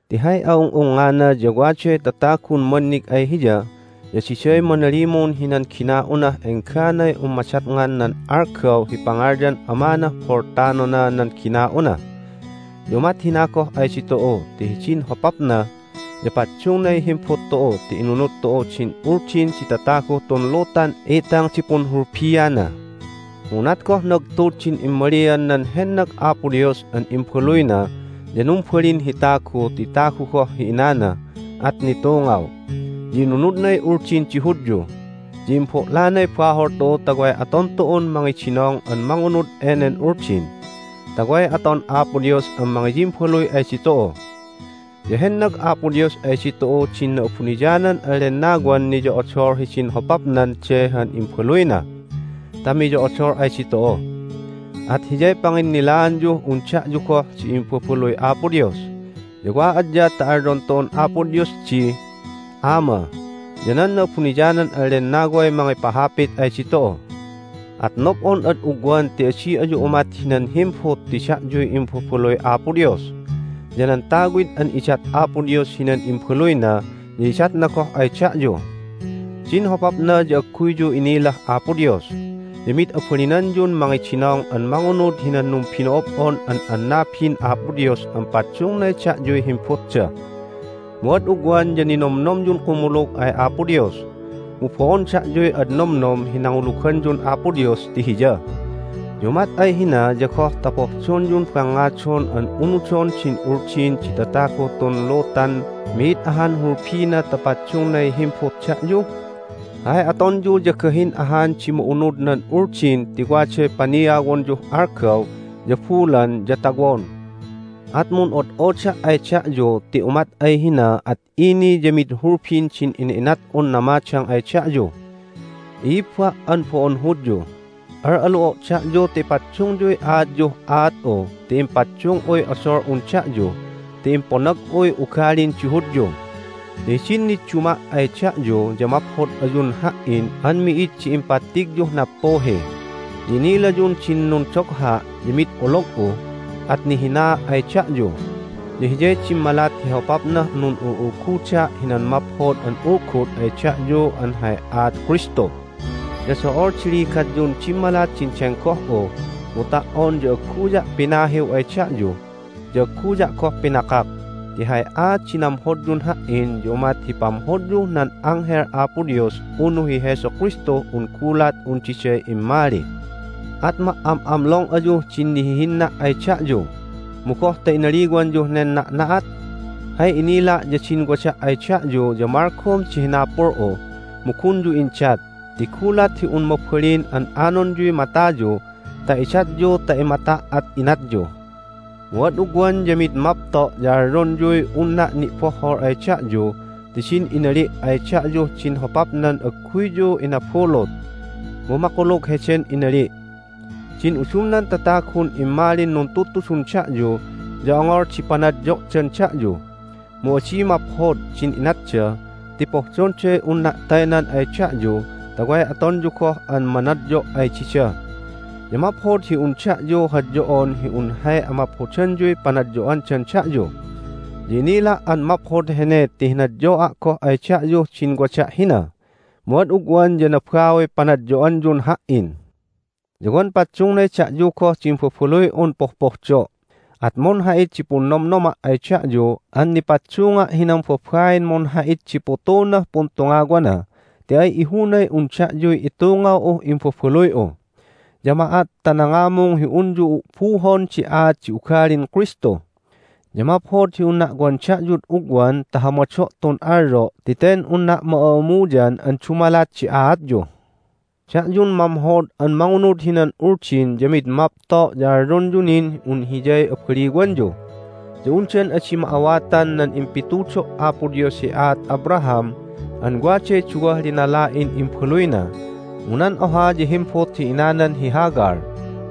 Ti hay a'ung'ungngana ya waday tatagun mannig ay hiya, ya diday manalimun hinan gina'unah engganay un madatngan nan algaw hi pangalyan amanah boltanona nan gina'una. Ya umat hina goh ay ditu'u ti hidin hopapna ya paddungnay himbut tu'u ti inunud tu'u din uldin di tataguh tun lutan itang di punhulbiana. Mu unat goh nagtud din immalian nan hennag Apo Dios an Imbaluyna ya numbalin hi tagu ti tagu goh hi inana, at nitungaw, ya inunudnay Uldin di Hudyu, ya imbo'lanay bahol tu'u ta way aton tu'un mangidinong an mangunud enen Uldin, ta way aton Apo Dios an mangiyimbaluy ay ditu'u. Ya hennag Apo Dios ay ditu'u din Na'abuniyanan an Lennawan niyo'odol hidin hopapnan de han Imbaluyna ta miyo'odol ay ditu'u. At Hiyay panginnilaanyuh un da'yu goh di imbabaluy Apo Dios, ya wa adya ta alyon tu'un Apo Dios di, "Ama!" ya nan Na'abuniyanan an Lennaway mangipahapit ay ditu'u. At nob'on ad ugwan ti adi ayu umat hinan himbut ti da'yuy imbabaluy Apo Dios. Ya nan tawid an idat Apo Dios hinan imbaluyna ya idatna goh ay da'yu! Din hopapna ya agguyyu innilah Apo Dios, ya mid abalinanyun mangidinong an mangunud hinan numbino'ob'on an annabin Apo Dios an paddungnay da'yuy himbutda. Mu ad ugwan ya ninomnomyun kumulug ay Apo Dios. Mu bo'on da'yuy ad nomnom hi nanguluganyun Apo Dios ti Hiya. Ya umat ay hina ya goh ta pohdonyun bangngadon an unudon din Uldin di tataguh tun lutan mi'id ahan hulbina ta paddungnay himbut da'yu? Hay atonyu ya gahin ahan di ma'unud nan Uldin ti waday paniawonyuh algaw, ya bulan, ya tawon. At mun'od'oda' ay da'yu ti umat ay hina at ini ya mid hulbin din ina'inat'un namadang ay da'yu! I'ibba' an bo'on Hudyu, al'alu'o' da'yu ta ipaddungyuy aatyuh aat'u ti impaddung'uy odol'un da'yu ti imponag'uy ugalin di Hudyu. Ya hidin nidduma' ay da'yu ya maphod ayun ha"in an mi'id di impattigyuh nappuhi. Ya inilayun din nundogha' ya mid olog'u, at nihinaa' ay da'yu, ya hiyay dimmalat hi hopapnah nun'ul'ulguda' hinan Maphod an Ulgud ay da'yu an hay aat Kristu. Ya do'ol di ligatyun dimmalat din denggoh'u, mu ta"on ya agguya' pinahiw ay da'yu, ya agguya' goh pinakak. Ti hay aat di namhodyun ha"in ya umat hi pamhodyuh nan anghel Apo Dios unu hi Jesu Kristuh un gulat un diday immali. At ma"am'amlong ayuh din nihihinna' ay da'yu. Mu goh ta inaliwanyuh nen na'na'at? Hay inila' ya din wada' ay da'yu ya malgom di hinapul'u, mu gunyu indat. Ti gulat hi un mabalin an anonyuy matayu ta idatyu ta imata' at inatyu! Mu ad ugwan ya mid mapto' ya alyonyuy unna' ni'bohhol ay da'yu ti din inali' ay da'yuh din hopapnan agguyyu inabulut! Mu makulug heden inali'. Din udumnan tatagun immalin nuntudtudun da'yu ya ongol di panadyo'dan da'yu. Mu adi maphod din inatda ti pohdonday unna' taynan ay da'yu ta way atonyu goh an manadyo' ay dida. Ya maphod hi un da'yu hadyo'on hi un hay amaphodanyuy panadyo'andan da'yu. Ya inila' an maphod hene ti hinadyo'a' goh ay da'yuh din wada' hina. Mu ad ugwan ya nabauy panadyo'anyun ha"in. Ya wan paddungnay da'yu goh di imbabaluy'un pohpohdo'. At munha'it di punnomnoma' ay da'yu an nipaddunga' hinan babain munha'it di putunah puntungawana, ti ay ihunay un da'yuy itungaw'uh imbabaluy'u. Ya ma'at ta nangamung hi unyu u'buhon di aat di ugalin Kristu. Ya maphod hi unna' wan da'yud ugwan ta hamado' tun alyo' ti ten unna' ma'a'amuyan an dumalat di aatyu. Da'yun mamhod an mangunud hinan Uldin ya mid mapto' ya alyonyu nin un hiyay abaliwanyu, ya undan adi ma'awatan nan impitudo' Apo Dios hi aat Abraham an waday duwah linala'in imbaluyna, mu nan oha ya himbut hi inanan hi Hagar,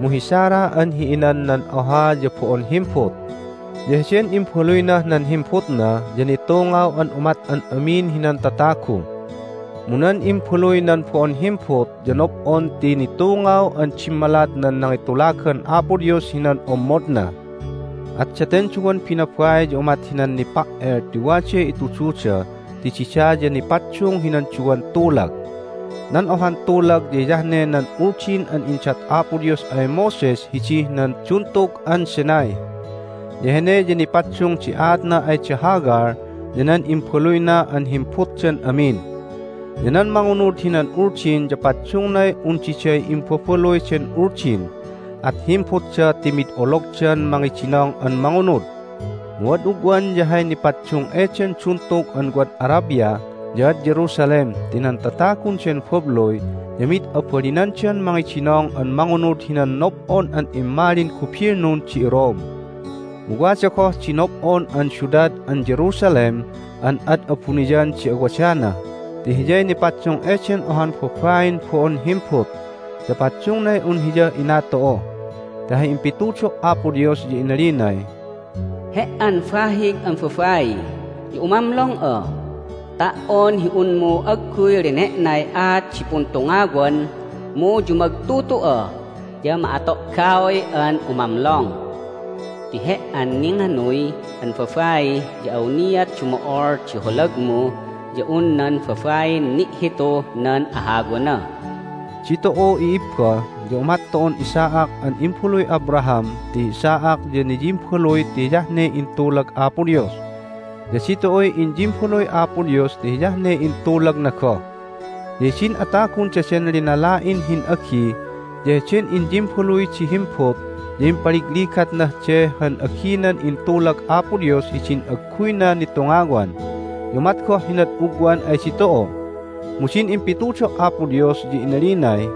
mu hi Sarah an hi inan nan oha ya bo'on himbut. Ya heden imbaluynah nan himbutna ya nitungaw an umat an amin hinan tatagu. Mu nan imbaluy nan bo'on himbut ya nob'on ti nitungaw an dimmalat nan nangitulagan Apo Dios hinan ommodna. At daten duwan binabai ya umat hinan nipa"el ti waday itududa ti dida ya nipaddung hinan duwan tulag. Nan ohan tulag ya hiyah ne nan Uldin an indat Apo Dios ay Moses hidih nan Duntug an Sinai, ya hene ya nipaddung di aatna ay da Hagar ya nan imbaluyna an himbutdan amin. Ya nan mangunud hinan Uldin ya paddungnay un diday imbabaluy den Uldin, at himbutda ti mid ologdan mangidinong an mangunud. Mu ad ugwan ya hay nipaddung eden duntug an wad Arabia ya ad Jerusalem ti nan tatagun den babluy ya mid abalinandan mangidinong an mangunud hinan nob'on an immalin gubilnun di iRome. Mu wada goh di nob'on an siudad an Jerusalem an ad abuniyan di awadana ti hiyay nipaddung eden ohan babain bo'on himbut, ya paddungnay un hiyah ina tu'u. Ti hay impitudo' Apo Dios ya inalinay, "He"an bahig an babai ya umamlong'a! Ta"on hi unmu agguy lene'nay aat di puntungawan mu yumagtutu'a ya ma'ato'gaoy'an umamlong! Ti he"an ninganuy an babai ya awniat dumo'ol di holagmu ya un nan babain ni'hituh nan ahawana." Ditu'u, i'ibba, ya umat tu'un Isaac an imbaluy Abraham ti hi Isaac ya niyimbaluy ti hiyah ne intulag Apo Dios. Ya ditu'uy inyimbaluy Apo Dios ti hiyah ne intulagna goh. Ya hidin atagun daden linala'in hin'agi ya heden inyimbaluy di himbut ya impaligligatnah de han aginan intulag Apo Dios hidin agguyna nitungawan. Ya umat goh hinad ugwan ay ditu'u! Mu din impitudo' Apo Dios ya inalinay,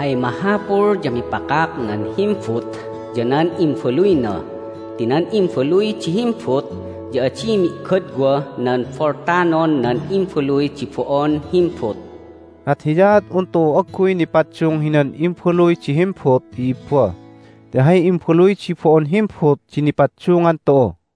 "Hay mahapul ya mipakak nan himbut ya nan imbaluyna ti nan imbaluy di himbut ya adi mi'godwah nan boltanon nan imbaluy di bo'on himbut." At hiyaat un tu'u agguy nipaddung hinan imbaluy di himbut, i'ibba, ti hay imbaluy di bo'on himbut di nipaddungan tu'u.